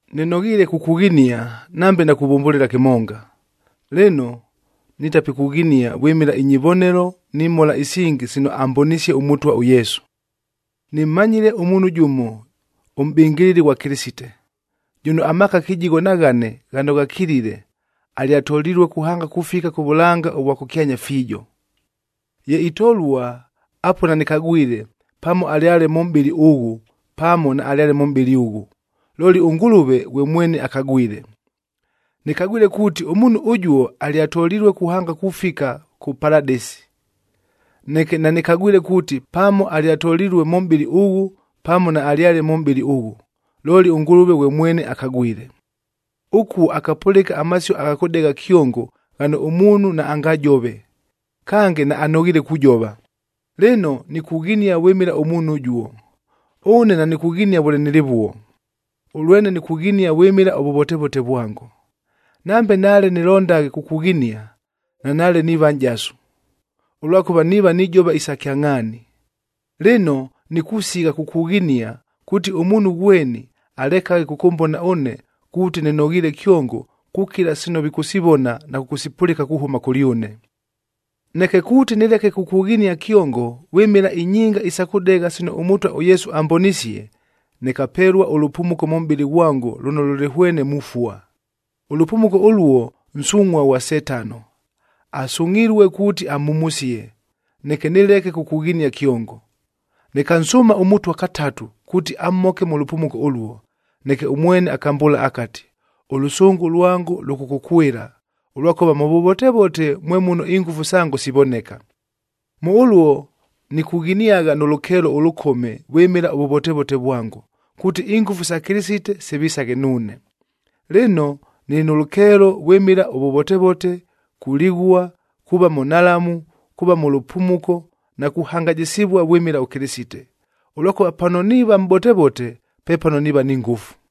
Nɨnoghiile kukughinia nambe nakuvʉmbʉlɨla kɨmonga. Lɨno, nitapikughinia vwɨmɨla inyivonelo ni mhola isingi sino ambonisie ʉMʉtwa ʉYesu. Nɨmmanyile ʉmuunhu jʉmo ʉmʼbɨngɨlɨli ghwa Kɨlɨsite, jʉno amaaka kɨjigho na ghane ghano ghakilile, alyatolilue kuhanga kufika kʉ vʉlanga ʉvwa kʉkyanya fiijo.a Ye itolua, apuo nanɨkagwile pamo alyale mʉ mʼbɨlɨ ʉghʉ, pamo naalyale mʉ mʼbɨlɨ ʉghʉ, looli ʉNgʉlʉve ghwe mwene akagwile. Nɨkagwile kuuti ʉmuunhu ʉjuo alyatolilue kuhanga kufika kʉ Paladɨsi.b Neke nanɨkagwile kuuti, pamo alyatolilue mʉ mʼbɨlɨ ʉghʉ, pamo naalyale mʉ mʼbɨlɨ ʉghʉ, looli ʉNgʉlʉve ghwe mwene akagwile. Ʉkuo akapʉlɨka amasio agha kʉdegha kyongo ghano ʉmuunhu naangajove, kange naanoghiile kujova. Lɨno, nikughinia vwɨmɨla ʉmuunhu ʉjuo. Ʉne nanikughinia vʉle nɨlɨvuo, ʉlwene nikughinia vwɨmɨla ʉvʉvotevote vwango. Nambe nale nɨlondaghe kukughinia, nanaale niiva nʼjasu, ʉlwakʉva niiva nijova isa kyangʼhaani. Lɨno, nikusigha kukughinia, kuuti ʉmuunhu ghweni alekaghe kʉkʉmbona ʉne kuuti nɨnoghiile kyongo kukila sino vikʉsivona na kʉkʉsipʉlɨka kuhʉma kʉlyʉne. Neke kuuti nɨleke kukughinia kyongo vwɨmɨla inyinga isa kʉdegha sino ʉMʉtwa ʉYesu ambonisie, nɨkapelua ʉlʉpumuko mʉ mʼbɨlɨ ghwango lʉno lʉlɨ hwene mufua. Ʉlʉpumuko ʉluo nsungʼhua ghwa Setano, asungʼhilue kuuti amhumusie, neke nɨleke kukughinia kyongo. Nɨkansʉʉma ʉMʉtwa katatu kuuti amhoke mʉ lʉpumuko ʉluo. Neke ʉmwene akambʉʉla akati, “Ʉlʉsʉngʉ lwango lʉkʉkʉkwɨla, ʉlwakʉva mʉ vʉvotevote mwe muno ingʉfu sango sivoneka.” Mʉ ʉluo nikughiniagha nʉ lʉkeelo ʉlʉkome vwɨmɨla ʉvʉvotevote vwango, kuuti ingʉfu sa Kɨlɨsite sivisaghe nuune. Lɨno, nɨlɨ nʉ lʉkeelo vwɨmɨla ʉvʉvotevote, kulighua, kuuva mʉ nhalamu, kuuva mʉ lʉpumuko na kuhangajɨsɨvua vwɨmɨla ʉKɨlɨsite; ʉlwakʉva pano niiva mʼbotevote, pepano niiva ni ngʉfu.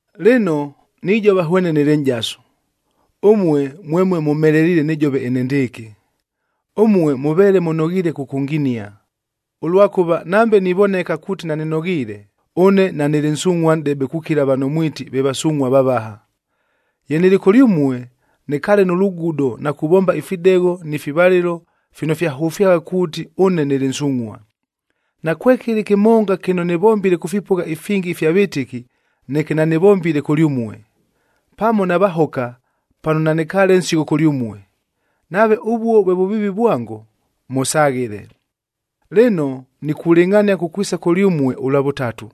Lɨno, nijova hwene nɨlɨ nʼjasu, ʉmue mwemue mʉmheleliile nɨjove enendɨɨkɨ. Ʉmue mʉveele mʉnoghiile kʉkʉnginia, ʉlwakʉva nambe nivoneka kuuti nanɨnoghiile, ʉne nanɨlɨ nsungʼhua nʼdebe kukila vano mwiti ve “vasungʼhua vavaha.” Ye nɨlɨ kʉlyʉmue, nɨkaale nʉ lugudo na kuvomba ifidegho ni fivalɨlo fino fyahʉfyagha kuuti ʉne nɨlɨ nsungʼhua. Nakwekɨlɨ kɨmonga kɨno nɨvombile kʉ fipʉgha ifingi ifya vɨtɨki, neke nanɨvombile kʉlyʉmue. Pamo navahoka pano nanɨkaale nsigho kʉlyʉmue. Nave ʉvuo vwe vʉviivi vwango, mʉsaghɨle! Lɨno, nikulɨngʼhania kukwisa kʉlyʉmue ʉlwa vʉtatu,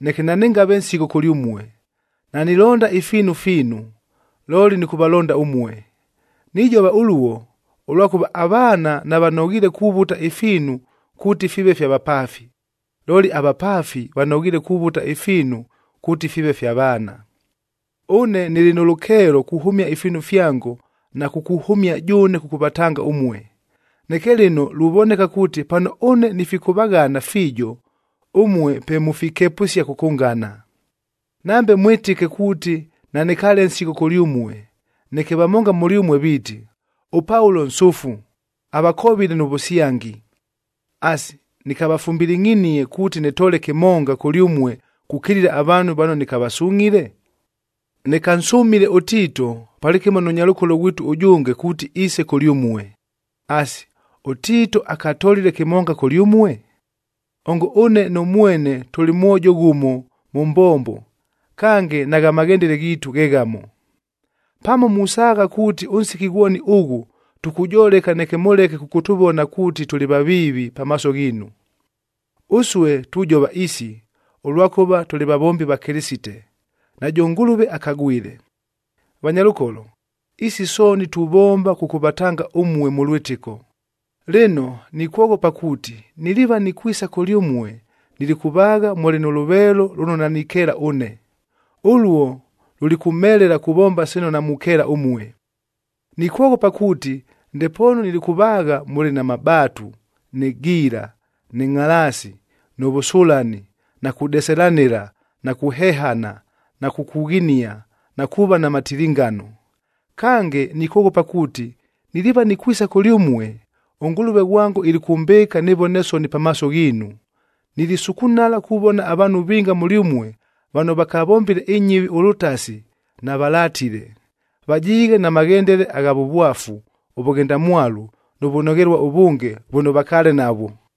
neke nanɨngave nsigho kʉlyʉmue. Nanilonda ifiinu fiinu, looli nɨkʉvalonda ʉmue. Nijova ʉluo, ʉlwakʉva avaana navanoghiile kuvuta ifiinu kuuti fiive fya vapaafi, looli avapaafi vanoghiile kuvuta ifiinu kuuti fiive fya vaana. Ʉne nɨlɨ nʉ lʉkeelo kuhʉmia ifiinu fyango na kukuhʉmia jʉʉne kʉkʉvatanga ʉmue. Neke lɨno luvoneka kuuti pano ʉne nifikʉvaghana fiijo, ʉmue pe mufikepʉsia kʉkʉngana. Nambe mwɨtɨke kuuti nanɨkaale nsigho kʉlyʉmue, neke vamonga mʉlyʉmue viiti, “ɄPaulo nsʉfu, avakovile nʉ vʉsyangi.” Asi, nɨkavafumbilingʼhinie kuuti nɨtoole kɨmonga kʉlyʉmue kukilila avaanhu vano nɨkavasungʼhile? Nɨkansʉmile ʉTiito palɨkɨmo nʉ nyalʉkolo ghwitu ʉjʉnge kuuti iise kʉlyʉmue. Asi, ʉTiito akatolile kɨmonga kʉlyʉmue? Ongo ʉne nʉ mwene tʉlɨ mwojo ghʉmo mʉ mbombo, kange nagha maghendele ghiitu ghe ghamo! Pamo musaagha kuuti ʉnsiki ghwoni ʉghʉ, tukujoleka neke mʉleke kʉkʉtʉvona kuuti tʉlɨ vaviivi pamaaso ghiinu. Ʉsue tujova isi, ʉlwakʉva tʉlɨ vavombi va Kɨlɨsite, najʉ Ngʉlʉve akagwile. Vanyalʉkolo, isi sooni tuvomba kʉkʉvatanga ʉmue mʉ lwɨtɨko. Lɨno nikwoghopa kuuti, niliiva nikwisa kʉlyʉmue nilikʉvaagha mʉlɨ nʉ lʉveelo lʉno nanikeela ʉne. Ʉluo, lulikʉmhelela kuvomba sino namukeela ʉmue. Nikwoghopa kuuti ndepoonu nilikʉvaagha mʉlɨ na mabaatu, nɨ giila, nɨ ngʼhalaasi, nʉ vʉsʉlani, na kudeselanɨla, na kuhehana, na kukughinia na kuuva na matilingano. Kange, nikwoghopa kuuti niliiva nikwisa kʉlyʉmue, ʉNgʉlʉve ghwango ilikʉmbɨɨka nɨvone soni pamaaso ghiinu. Nilisukunala kuvona avaanhu vinga mʉlyʉmue vano vakavombile inyɨvi ʉlʉtasi, navalatile. Vajiighe na maghendele agha vʉvwafu, ʉvʉghendamwalu nʉ vʉnoghelua ʉvʉnge vʉno vakaale navwo.